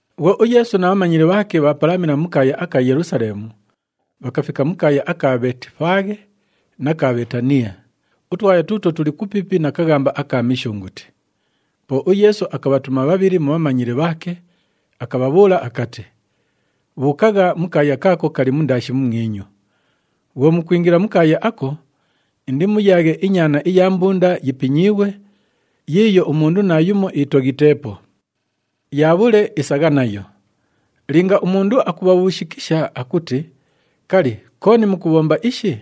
Bhwo uYeesu na bhamanyili bhaake bhaapalamila mu kaaya aka Yelusaleemu, bhakafika mu kaaya aka Bheetifaaghe na ka Bheetaniya, utwaya tuutwo tuli kupiipi na kaghamba aka Mishunguti. Po uYeesu akabhatuma bhabhili mu bhamanyili bhaake, akabhabhuula akati, “Bhuukagha mu kaaya kaako kali mundaashi mumwinyu. Bhwo mukwingila mu kaaya ako, indimuyaaghe inyaana iya mbunda yipinyiighwe, yiiyo umundu naayumo itoghiteepo. Yaabhule, isagha nayo. Linga umundu akubhabhuushikisha akuti, ‘Kali, kooni mukubhomba ishi?’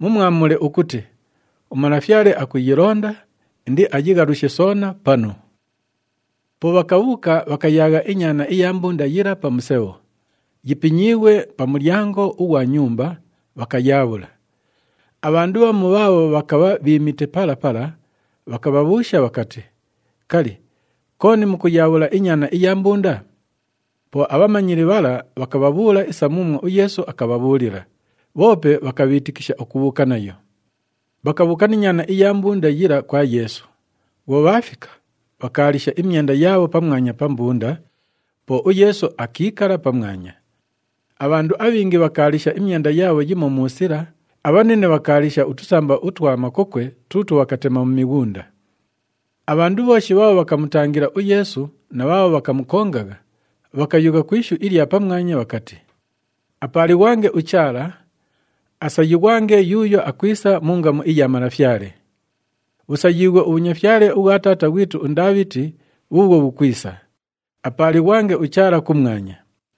Mumwamule ukuti, ‘UMalafyale akuyilonda, indiayighalushe soona panu.’” Po bhakabhuuka, bhakayaagha inyaana iya mbunda yila pa musebho, yipinyiighwe pa mulyango ughwa nyumba, bhakayaabhula. Abhandu bhamu bhaabho bhakabha bhiimite pala pala, bhakabhabhuusha bhakati, “Kali, kooni mukuyaabhula inyaana iya mbunda?” Po abhamanyili bhala bhakabhabhuula isa muumwo uYeesu akabhabhuulila, bhoope bhakabhiitikisha ukubhuuka nayo. Bhakabhuuka ni nyaana iya mbunda yila kwa Yeesu. Bhwo bhaafika, bhakaalisha imyenda yaabho pamwanya pa mbunda, po uYeesu akiikala pamwanya. Abhandu abhingi bhakaalisha imyenda yaabho yimo mu sila, abhanine bhakaalisha utusamba utwa makokwe tuutwo bhakatema mu mighunda. Abhandu bhooshi bhaabho bhakamutangila uYeesu na bhaabho bhakamukongagha, bhakayugha ku ishu ilya pamwanya bhakati, “Apaalighwange uChaala! Asayighwange yuuyo akwisa mu ngamu iya Malafyale! Bhusayiighwe ubhunyafyale ubhwa taata ghwitu uNdaabhiti bhuubhwo bhukwisa. Apaalighwange uChaala kumwanya!”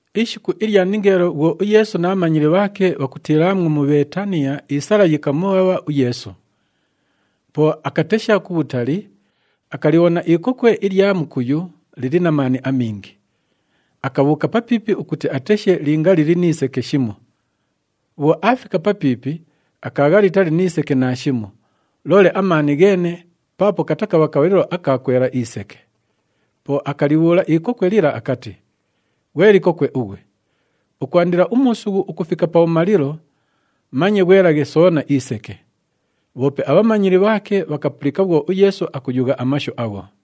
Ishiku ilya ningeelo bhwo uYeesu na bhamanyili bhaake bhakutiilaamwo mu Bheetaniya, isala yikamubhabha uYeesu. Po akatesha kubhutali, akalibhona ikokwe ilya mukuyu lili na maani amingi. Akabhuuka papiipi ukuti ateshe linga lili ni seke shimo. Bhwo aafika papiipi, akaagha litali ni seke naashimo, loole amaani gheene paapo katakabha kabhalilo aka kwela iseke. Po akalibhuula ikokwe lila akati, “Ghwe likokwe ughwe, ukwandila umuusughu ukufika pabhumalilo, manye ghwelaghe soona iseke.” Bhoope abhamanyili bhaake bhakapulika bhwo uYeesu akuyugha amashu agho.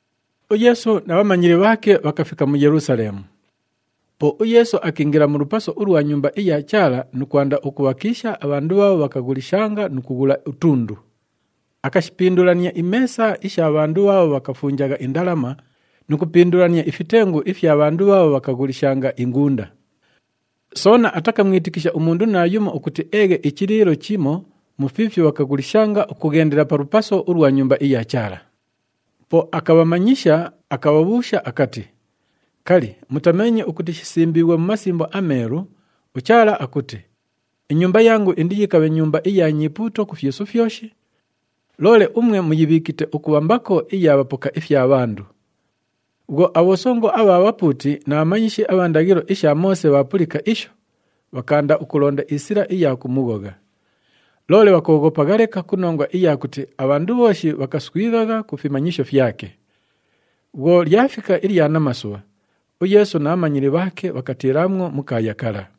UYeesu na bhamanyili bhaake bhakafika mu Yelusaleemu. Po uYeesu akiingila mu lupaso ulwa Nyumba iya Chaala nu kwanda ukubhakiisha abhandu bhaabho bhakaghulishanga nu kughula utundu. Akashipindulania imeesa isha bhandu bhaabho bhakafunjagha indalama nu kupindulania ifitengu ifya bhandu bhaabho bhakaghulishanga ingunda. Soona atakamwitikisha umundu naayumo ukuti eeghe ichiliilo chimo mu fiifyo bhakaghulishanga ukughendela pa lupaso ulwa Nyumba iya Chaala. Po akabhamanyisha, akabhabhuusha akati, “Kali, mutameenye ukuti shisimbiighwe mu Masimbo aMeelu, uChaala akuti, ‘Inyumba yangu indiyikabhe nyumba iya nyipuuto ku fyisu fyoshi’? Loole umwe muyibhiikite ukubha mbako iya bhapoka ifya bhandu.” Bhwo abhosongo abha bhapuuti na bhamanyishi abha ndaghilo isha Moose bhaapulika isho, bhakaanda ukulonda isila iya kumughogha. Loole bhakooghopagha leka ku nongwa iya kuti abhandu bhooshi bhakaswighagha ku fimanyisho fyake. Bhwo lyafika ilya namasubha, uYeesu na bhamanyili bhaake bhakatiilaamwo mu kaaya kala.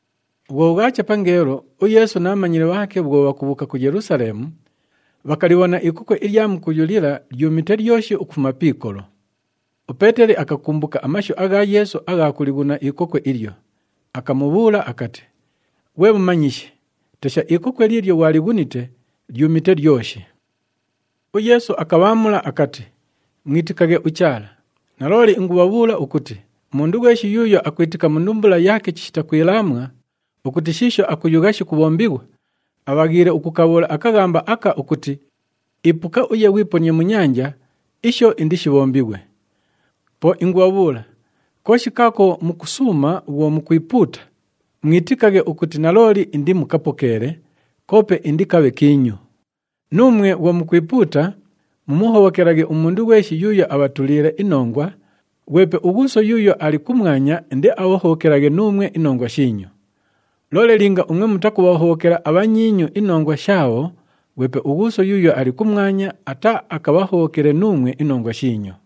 Bhwo bhwacha pangeelo, uYeesu na bhamanyili bhaake bhwo bhakubhuuka ku Yelusaleemu, bhakalibhona ikokwe ilya mukuyu lila lyumite lyoshi ukufuma pi ikolo. UPeeteli akakumbuka amashu agha Yeesu agha kulighuna ikokwe ilyo, akamubhuula akati, “Ghwe Mumanyishi, tesha, ikokwe liilyo ghwalighunite, lyumite lyoshi!” UYeesu akabhaamula akati, “Mwitikaghe uChaala. Nalooli ingubhabhuula ukuti umundu ghweshi yuuyo akwitika mu ndumbula yaake chishita kwilaamwa ukuti shiisho akuyugha shikubhombighwa, abhaghiile ukukabhuula akaghamba aka ukuti, ‘Ipuka uye ghwiponie mu nyanja,’ isho, indishibhombighwe. Po ingubhabhuula, kooshi kaako mukusuuma bhwo mukwipuuta, mwitikaghe ukuti nalooli indimukapokeele, koope indikabhe kiinyu. Nuumwe bhwo mukwipuuta, mumuhobhokelaghe umundu ghweshi yuuyo abhatuliile inongwa, ghwepe uGhuuso yuuyo ali kumwanya indiabhahobhokelaghe nuumwe inongwa shiinyu. [ Loole linga umwe mutakubhahobhokela abhanyiinyu inongwa shaabho, ghwepe uGhuuso yuuyo ali kumwanya ataaakabhahobhokele nuumwe inongwa shiinyu.]”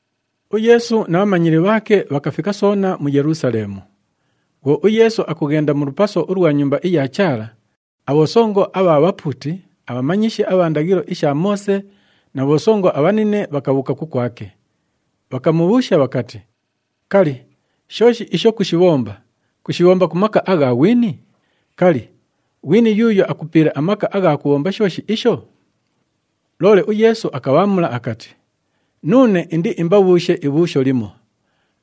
UYeesu na bhamanyili bhaake bhakafika soona mu Yelusaleemu. Bhwo uYeesu akughenda mu lupaso ulwa Nyumba iya Chaala, abhosongo abha bhapuuti, abhamanyishi abha ndaghilo isha Moose na bhosongo abhanine bhakabhuuka kukwake. Bhakamubhuusha bhakati, “Kali, shooshi isho kushibhomba, kushibhomba ku maka agha ghwini? Kali, ghwini yuuyo akupiile amaka agha kubhomba shooshi isho?” Loole uYeesu akabhaamula akati, “Nuune indiimbabhuushe ibhuusho limo.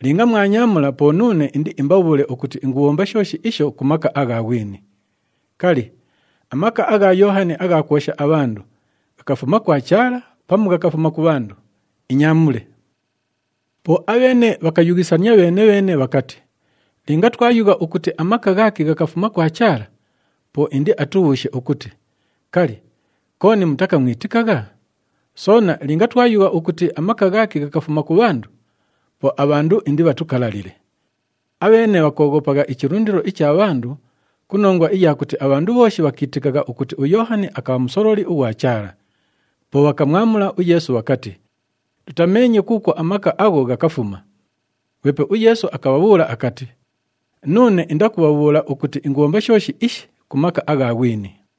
Linga mwanyaamula, po nuune indiimbabhuule ukuti ingubhomba shooshi isho ku maka agha ghwini. Kali, amaka agha Yoohani agha kwosha abhandu ghakafuma kwa Chaala pamu ghakafuma ku bhandu? Inyaamule.” Po abheene bhakayughisania bheene-bheene bhakati, “Linga twayugha ukuti, ‘Amaka ghaake ghakafuma kwa Chaala,’ po indiatubhuushe ukuti, ‘Kali, kooni mutakamwitikagha?’ Soona linga twayugha ukuti, ‘Amaka ghaake ghakafuma ku bhandu,’ po abhandu indibhatukalalile.” Abheene bhakooghopagha ichilundilo icha bhandu ku nongwa iya kuti abhandu bhooshi bhakiitikagha ukuti uYoohani akabha musololi ughwa Chaala. Po bhakamwamula uYeesu bhakati, “Tutameenye kuukwo amaka agho ghakafuma.” Ghwepe uYeesu akabhabhuula akati, “Nuune indakubhabhuula ukuti ingubhomba shooshi ishi ku maka agha ghwini.”